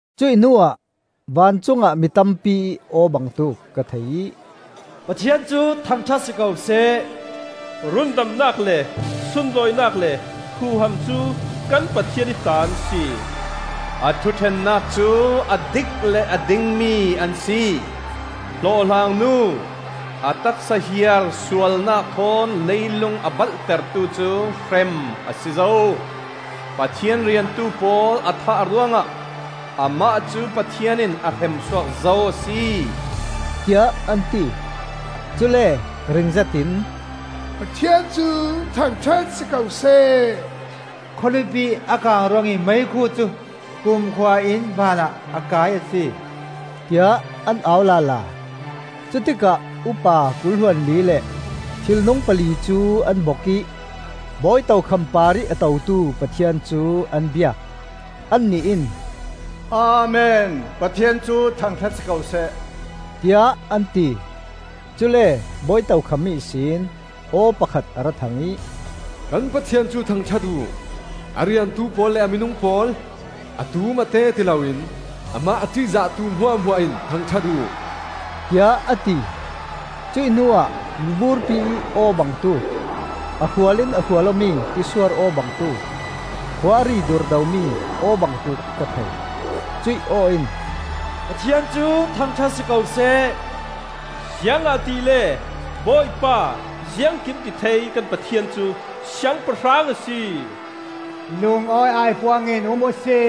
Cuih hnuah vancungah mi tampi-ih aw bangtuk ka thei ih, “Pathian cu thangṭhat si ko seh! Rundamnak le sunlawinak le huham cu kan Pathian ih ta an si! A thuṭhennak cu a dik le a dingmi an si. Hlawhhlang nu, a taksa hiar sualnak thawn leilung a balhtertu cu hrem a si zo. Pathian riantu pawl a thah ruangah amah cu Pathian in a hremsuak zo a si,” tiah an ti. Cule ringzet in, “Pathian cu thangṭhat si ko seh! Khawlipi a kang ruangih meikhu cu kumkhua in vanah a kai a si,” tiah an au lala. Cutikah upa kul hluanli le thilnung pali cu an bok ih bawi tokham parih a totu Pathian cu an biak. Annih in, “Amen! Pathian cu thangṭhat si ko seh,” tiah an ti. Cule bawi tokham ihsin aw pakhat a ra thang ih, “Kan Pathian cu thangṭhat uh; a riantu pawl le a minung pawl, a tum a te ti loin amah a ṭihzahtu hmuahhmuah in thangṭhat uh,” tiah a ti. Cuih hnuah miburpi ih aw bangtuk, a hrual in a hrual awmi tisuar aw bangtuk, khua a ri durdomi aw bangtuk ka thei. Cuih aw in, “Pathian cu thangṭhat si ko seh! Ziangahtile Bawipa, Ziangkimtithei kan Pathian cu Siangpahrang a si! Lungawi aipuang in um uhsi!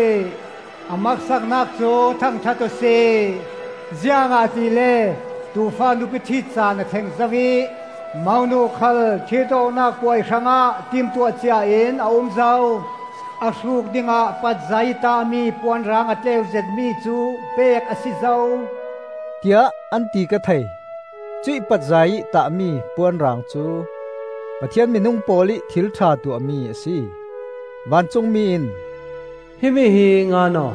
A maksaknak cu thangṭhat uhsi! Ziangahtile Tuufa nupi ṭhit caan a thleng zo ih monu khal ṭhit awknak puai hrangah timtuah ciain a um zo. A hruk dingah patzai in tahmi puanrang a tleu zetmi cu pek a si zo,” tiah an ti ka thei. Cuih patzai ih tahmi puanrang cu Pathian minung pawl ih thilṭha tuahmi a si. Vancungmi in, “Himi hi ngan aw: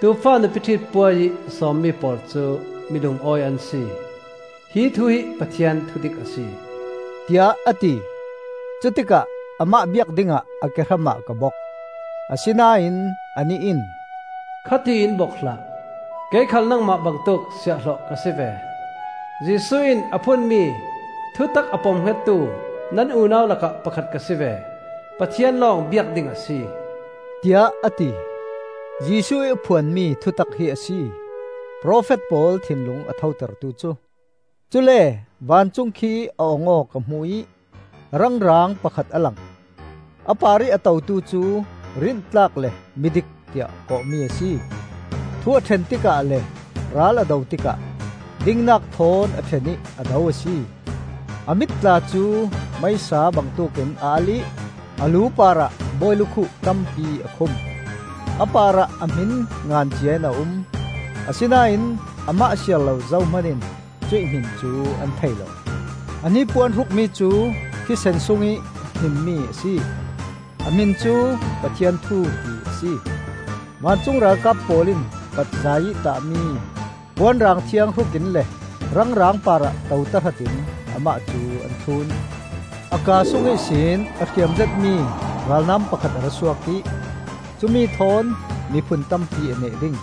Tuufa nupi ṭhit puai ih sawmmi pawl cu mi lungawi an si. Hi thu hi Pathian thudik a si,” tiah a ti. Cutikah amah biak dingah a kehramah ka bok, asinain anih in, “Khatiin bok hlah! Kei khal nangmah bangtuk siahhlawh ka si ve; Jesuh in a phuanmi thutak a pomhngettu nan unau lakah pakhat ka si ve. Pathian lawng biak ding a si,” tiah a ti. Jesuh ih a phuanmi thutak hi a si profet pawl thinlung a thotertu cu! Cule vancung khi a ong aw ka hmu ih rang raang pakhat a lang. A parih a totu cu Rintlak le Midik tiah kawhmi a si. Thu a ṭhen tikah le ral a do tikah dingnak thawn a ṭhen ih a do a si. A mit tla cu meisa bangtuk in a alh ih a lu parah bawi lukhuh tampi a khum. A parah a hmin ngan ciain a um, asinain amah siar lo zohman in cuih hmin cu an thei lo. A hnipuan hrukmi cu thisen sungih hnimmi a si. A hmin cu, “Pathian Thu,” ti a si. Vancung ralkap pawl in patzai ih tahmi puanrang thiang hruk in le rang raang parah to tahratin amah cu an thlun. A kaa sung ihsin a hriam zetmi ralnam pakhat a ra suak ih cumi thawn miphun tampi a neh ding.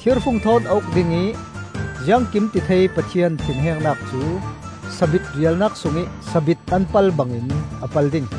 Thirfung thawn a uk ding ih Ziangkimtithei Pathian thinhengnak cu sabit rialnak sungih sabit an pal bangin a pal ding.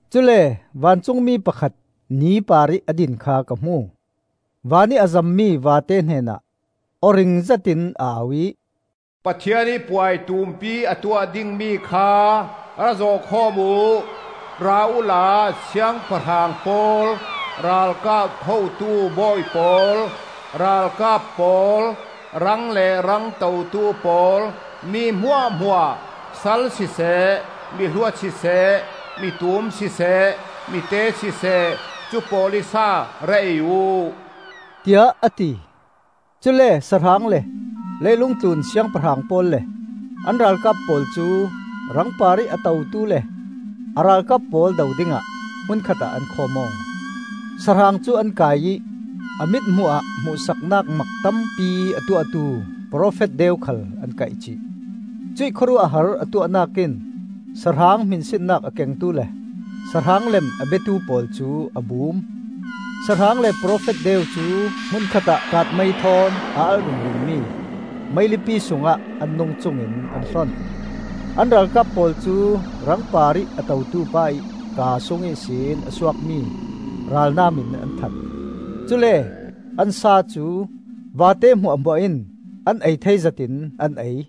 Cule vancungmi pakhat ni parih a din kha ka hmu. Van ih a zammi vate hnenah aw ring zetin a au ih, “Pathian ih puai tumpi a tuah dingmi kha ra zawh khawm uh. Ra uhla siangpahrang pawl, ralkap hotu bawi pawl, ralkap pawl, rang le rang totu pawl, mi hmuahhmuah, sal siseh miluat siseh, mitum siseh mite siseh, cu pawl ih sa ra ei uh,” tiah a ti. Cule sahrang le leilung tlun siangpahrang pawl le an ralkap pawl cu rang parih a totu le a ralkap pawl do dingah hmun khatah an khawm aw. Sahrang cu an kai ih a mithmuh ah hmuhsaknak mak tampi a tuahtu profet deu khal an kaih cih. Cuih khawruahhar a tuahnak in sahrang hminsinnak a kengtu le sahrang lem a biatu pawl cu a bum. Sahrang le profet deu cu hmun khatah kaatmei thawn a alh ringringmi meilipi sungah an nungcung in an hlon. An ralkap pawl cu rang parih a totu pa ih kaa sung ihsin a suakmi ralnam in an that. Cule an sa cu vate hmuahhmuah in an ei thei zat in an ei.